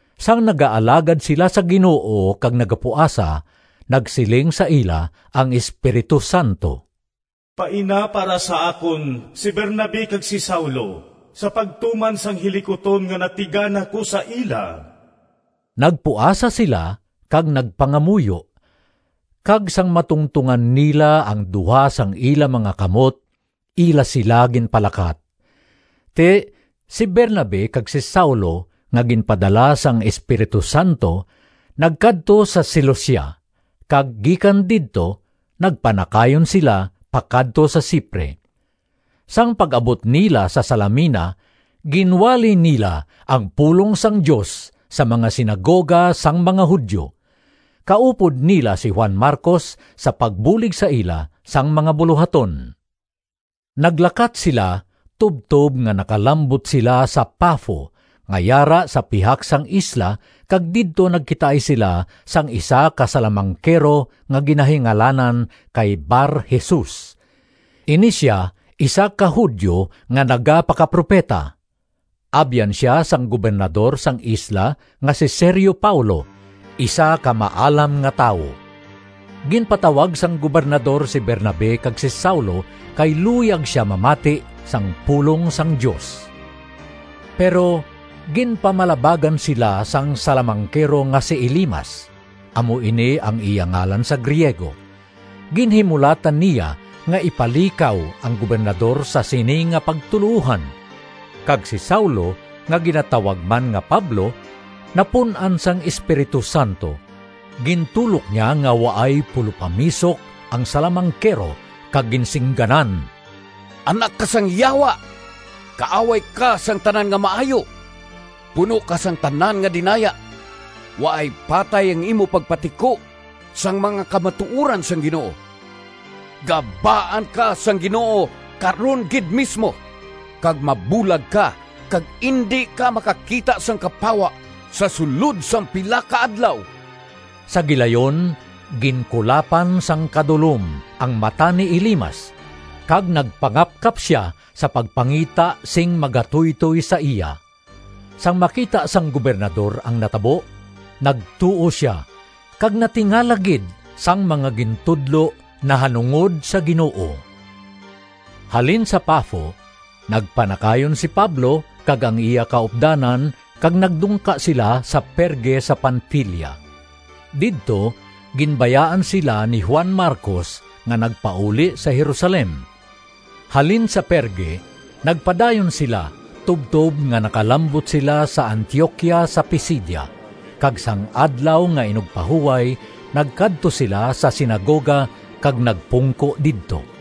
Sang nagaalagad sila sa Ginoo kag nagapuasa, nagsiling sa ila ang Espiritu Santo, “Paina para sa akon si Bernabe kag si Saulo, sa pagtuman sang hilikuton nga natigana ko sa ila.” Nagpuasa sila kag nagpangamuyo, kag sang matungtongan nila ang duha sang ila mga kamot, ila sila ginpalakat. Ti, si Bernabe kag si Saulo nga ginpadala sang Espiritu Santo nagkadto sa Seleucia, kag gikan didto nagpanakayon sila pakadto sa Cipre. Sang pag-abot nila sa Salamina ginwali nila ang pulong sang Dios sa mga sinagoga sang mga Judio. Kaupod nila si Juan Marcos sa pagbulig sa ila sa mga bulohaton. Naglakat sila tubtob nga nakalambot sila sa Pafo nga yara sa pihak sang isla kag didto nagkitaay sila sang isa ka salamangkero nga ginahingalanan kay Bar-Jesus. Ini sia isa ka Judio nga nagapakapropeta. Abyan sia sang Gobernador sang isla nga si Sergio Paulo, isa ka maalam nga tawo. Ginpatawag sang Gobernador si Bernabe kag si Saulo, kay luyag sia mamati sang pulong sang Dios. Pero ginpamalabagan sila sang salamangkero nga si Elimas (amo ini ang iya ngalan sa Griego). Ginhimulatan niya nga ipalikaw ang Gobernador sa sini nga pagtuloohan. Kag si Saulo, nga ginatawag man nga Pablo, napun-an sang Espiritu Santo; gintulok niya nga waay pulopamisok ang salamangkero kag ginsingganan, “Anak ka sang Yawa! Kaaway ka sang tanan nga maayo! Puno ka sang tanan nga dinaya! Waay patay ang imo pagpatiko sang mga kamatuoran sang Ginoo! Gabaan ka sang Ginoo karon gid mismo, kag mabulag ka kag indi ka makakita sang kapawa sa sulod sang pila ka adlaw.” Sa gilayon ginkulapan sang kadulom ang mata ni Elimas kag nagpangapkap sia sa pagpangita sing magatuytoy sa iya. Sang makita sang Gobernador ang natabo, nagtuo sia kag natingala gid sang mga gintudlo nahanungod sa Ginoo. Halin sa Pafo, nagpanakayon si Pablo kag ang iya kaupdanan kag nagdungka sila sa Perge sa Panfilia. Didto ginbayaan sila ni Juan Marcos nga nagpauli sa Jerusalem. Halin sa Perge nagpadayon sila tubtob nga nakalambot sila sa Antioquia sa Pisidia, kag sang Adlaw nga Inugpahuway nagkadto sila sa sinagoga kag nagpungko didto.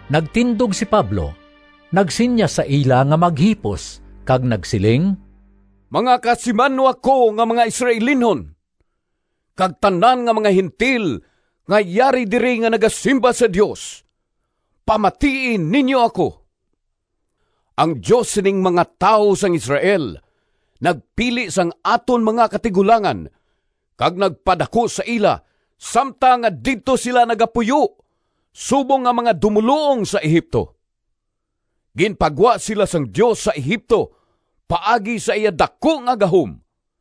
Nagtindog si Pablo, nagsinyas sa ila nga maghipos kag nagsiling: “Mga kasimanwa ko nga mga Israelinhon kag tanan nga mga Gentil nga yari diri nga nagasimba sa Dios, pamatii ninyo ako! Ang Dios sining mga tawo sang Israel nagpili sang aton mga katigulangan kag nagpadaku sa ila samtang nga didto sila nagapuyo subong nga mga dumoluong sa Egipto. Ginpagwa sila sang Dios sa Egipto paagi sa iya daku nga gahom,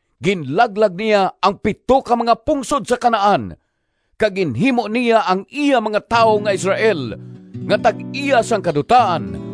Ginlaglag niya ang pito ka mga pungsod sa Canaan kag ginhimo niya ang iya mga tawo nga Israel nga tag-iya sang kadutaan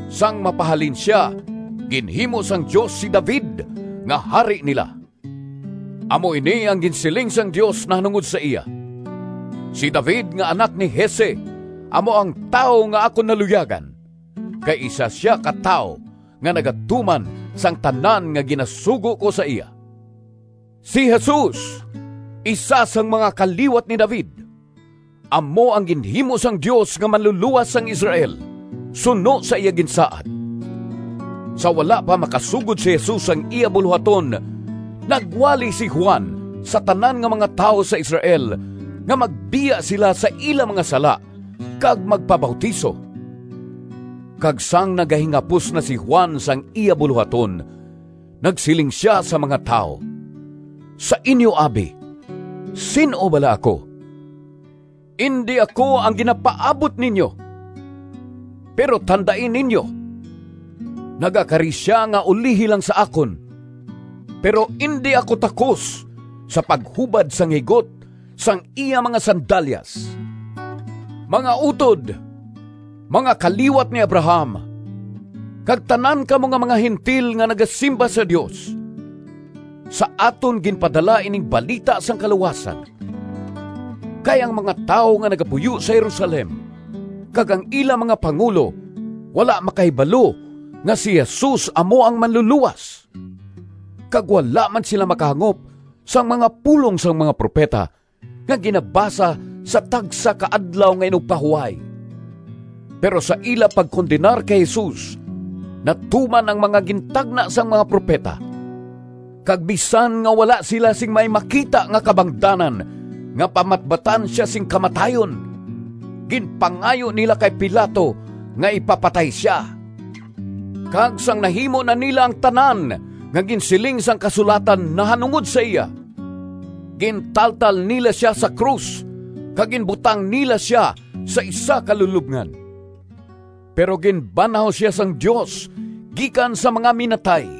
Sang mapahalin sia, ginhimo sang Dios si David nga hari nila. Amo ini ang ginsiling sang Dios nahanungod sa iya, ‘Si David nga anak ni Jese amo ang tawo nga akon naluyagan, kay isa sia ka tawo nga nagatuman sang tanan nga ginasugo ko sa iya.’ Si Jesus, isa sang mga kaliwat ni David, amo ang ginhimo sang Dios nga Manlulowas sang Israel suno sa iya ginsaad. Sa wala pa makasugod si Jesus sang iya bulohaton, nagwali si Juan sa tanan nga mga tawo sa Israel nga magbiya sila sa ila mga sala kag magpabautiso. Kag sang nagahingapos na si Juan sang iya bulohaton, nagsiling sia sa mga tawo, ‘Sa inyo abi, sin-o bala ako? Indi ako ang ginapaabot ninyo. Pero tandai ninyo! Nagakari sia nga ulihi lang sa akon, pero indi ako takos sa paghubad sang higot sang iya mga sandalyas.’ “Mga utod, mga kaliwat ni Abraham, kag tanan kamo nga mga Gentil nga nagasimba sa Dios: sa aton ginpadala ining balita sang kaluwasan! Kay ang mga tawo nga nagapuyo sa Jerusalem kag ang ila mga pangulo wala makahibalo nga si Jesus amo ang Manlulowas, kag wala man sila makahangop sang mga pulong sang mga propeta nga ginabasa sa tagsa ka Adlaw nga Inugpahuway. Pero sa ila pagkondenar kay Jesus natuman ang mga gintagna sang mga propeta. Kag bisan nga wala sila sing may makita nga kabangdanan nga pamatbatan sia sing kamatayon, ginpangayo nila kay Pilato nga ipapatay sia. Kag sang nahimo na nila ang tanan nga ginsiling sang Kasulatan nahanungod sa iya, gintaltal nila sia sa krus, kag ginbutang nila sia sa isa ka lulobngan. Pero ginbanhaw sia sang Dios gikan sa mga minatay,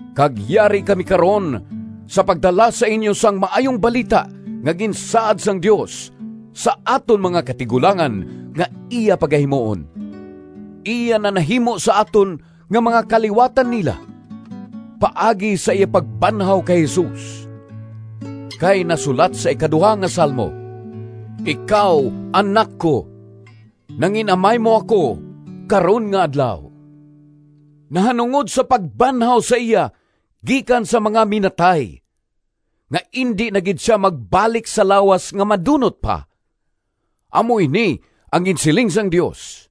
Kag yari kami karon sa pagdala sa inyo sang Maayong Balita nga ginsaad sang Dios sa aton mga katigulangan nga iya pagahimuon, iya na nahimo sa aton nga mga kaliwatan nila, paagi sa iya pagbanhaw kay Jesus. Kay nasulat sa ikaduha nga Salmo: ‘Ikaw Anak ko, Nangin-amay mo ako karon nga adlaw.’ Nahanungod sa pagbanhaw sa iya gikan sa mga minatay, nga indi na gid sia magbalik sa lawas nga madunot pa, amo ini ang ginsiling sang Dios: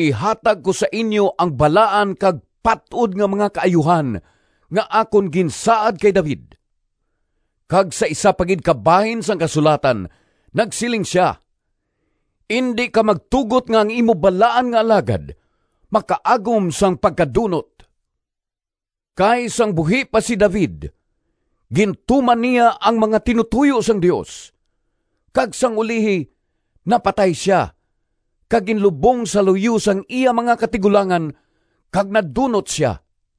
‘Ihatag ko sa inyo ang balaan Kag pat-od nga mga kaayuhan Nga akon ginsaad kay David.’ Kag sa isa pa gid ka bahin sang kasulatan, nagsiling sia: ‘Indi ka magtugot Nga ang imo balaan nga alagad Makaagom sang pagkadunot.’ Kay sang buhi pa si David gintuman niya ang mga tinutoyo sang Dios, kag sang ulihi napatay sia kag ginlubong sa luyo sang iya mga katigulangan, kag nadunot sia.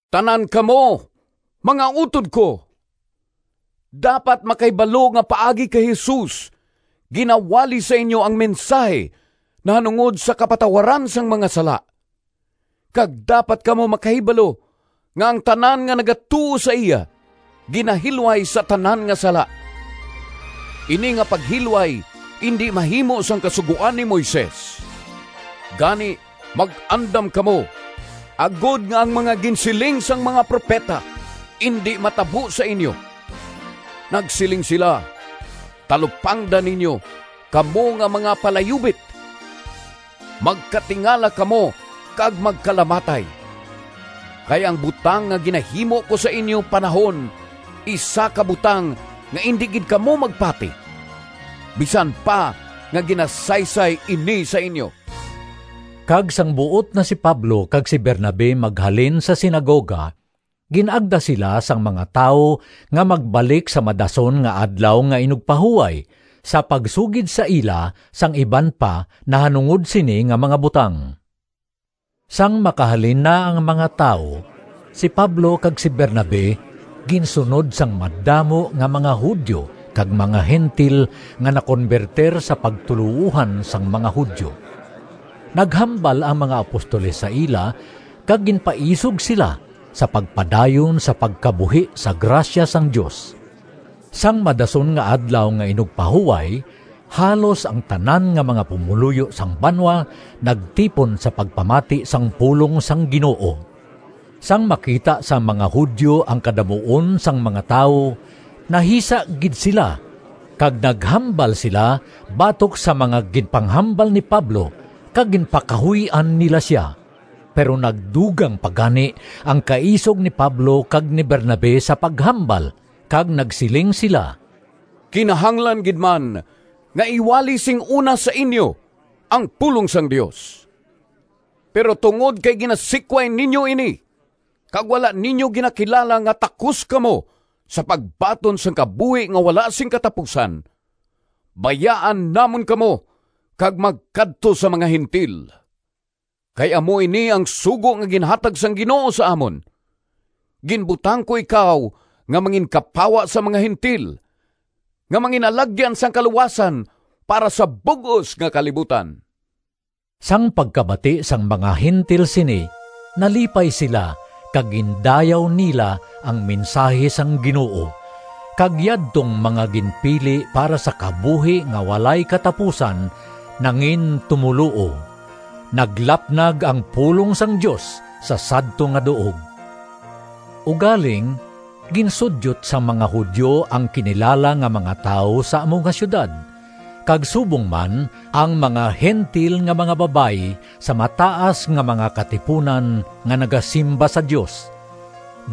Tanan kamo, mga utod ko, dapat makahibalo nga paagi kay Jesus ginawali sa inyo ang mensahi nahanungod sa kapatawaran sang mga sala, kag dapat kamo makahibalo nga ang tanan nga nagatuo sa iya ginahilway sa tanan nga sala. Ini nga paghilway indi mahimo sang Kasugoan ni Moises. Gani mag-andam kamo, agod nga ang mga ginsiling sang mga propeta indi matabo sa inyo. Nagsiling sila: ‘Talupangda ninyo, Kamo nga mga palayubit! Magkatingala kamo kag magkalamatay! Kay ang butang Nga ginahimo ko sa inyo panahon Isa ka butang Nga indi gid kamo magpati, Bisan pa nga ginasaysay ini sa inyo!’” Kag sang buot na si Pablo kag si Bernabe maghalin sa sinagoga, gin-agda sila sang mga tawo nga magbalik sa madason nga Adlaw nga Inugpahuway sa pagsugid sa ila sang iban pa nahanungod sini nga mga butang. Sang makahalin na ang mga tawo, si Pablo kag si Bernabe ginsunod sang madamo nga mga Judio kag mga Gentil nga nakonbertir sa pagtuloohan sang mga Judio. Naghambal ang mga apostoles sa ila kag ginpaisog sila sa pagpadayon sa pagkabuhi sa grasya sang Dios. Sang madason nga Adlaw nga Inugpahuway halos ang tanan nga mga pumoluyo sang banwa nagtipon sa pagpamati sang pulong sang Ginoo. Sang makita sang mga Judio ang kadamuon sang mga tawo, nahisa gid sila kag naghambal sila batok sa mga ginpanghambal ni Pablo kag ginpakahuy-an nila sia. Pero nagdugang pa gani ang kaisog ni Pablo kag ni Bernabe sa paghambal kag nagsiling sila, “Kinahanglan gid man nga iwali sing una sa inyo ang pulong sang Dios. Pero tungod kay ginasikway ninyo ini, kag wala ninyo ginakilala nga takos kamo sa pagbaton sang kabuhi nga wala sing katapusan, bayaan namon kamo kag magkadto sa mga Gentil. Kay amo ini ang sugo nga ginhatag sang Ginoo sa amon: ‘Ginbutang ko ikaw Nga manginkapawa sa mga Gentil, Nga mangin-alagyan sang kaluwasan Para sa bug-os nga kalibutan.’” Sang pagkabati sang mga Gentil sini nalipay sila kag gindayaw nila ang mensahi sang Ginoo, kag yadtong mga ginpili para sa kabuhi nga walay katapusan nangintumoluo. Naglapnag ang pulong sang Dios sa sadto nga duog. Ugaling ginsudyot sang mga Judio ang kinilala nga mga tawo sa amo nga siyudad, kag subong man ang mga Gentil nga mga babayi sa mataas nga mga katipunan nga nagasimba sa Dios.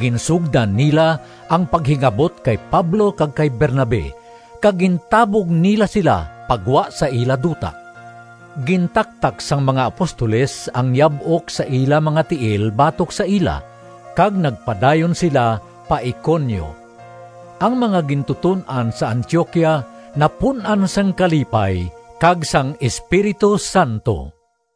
Ginsugdan nila ang paghingabot kay Pablo kag kay Bernabe, kag gintabog nila sila pa gwa sa ila duta. Gintaktak sang mga apostoles ang yab-ok sa ila mga tiil batok sa ila, kag nagpadayon sila pa Iconio. Ang mga gintuton-an sa Antioquia napun-an sang kalipay kag sang Espiritu Santo.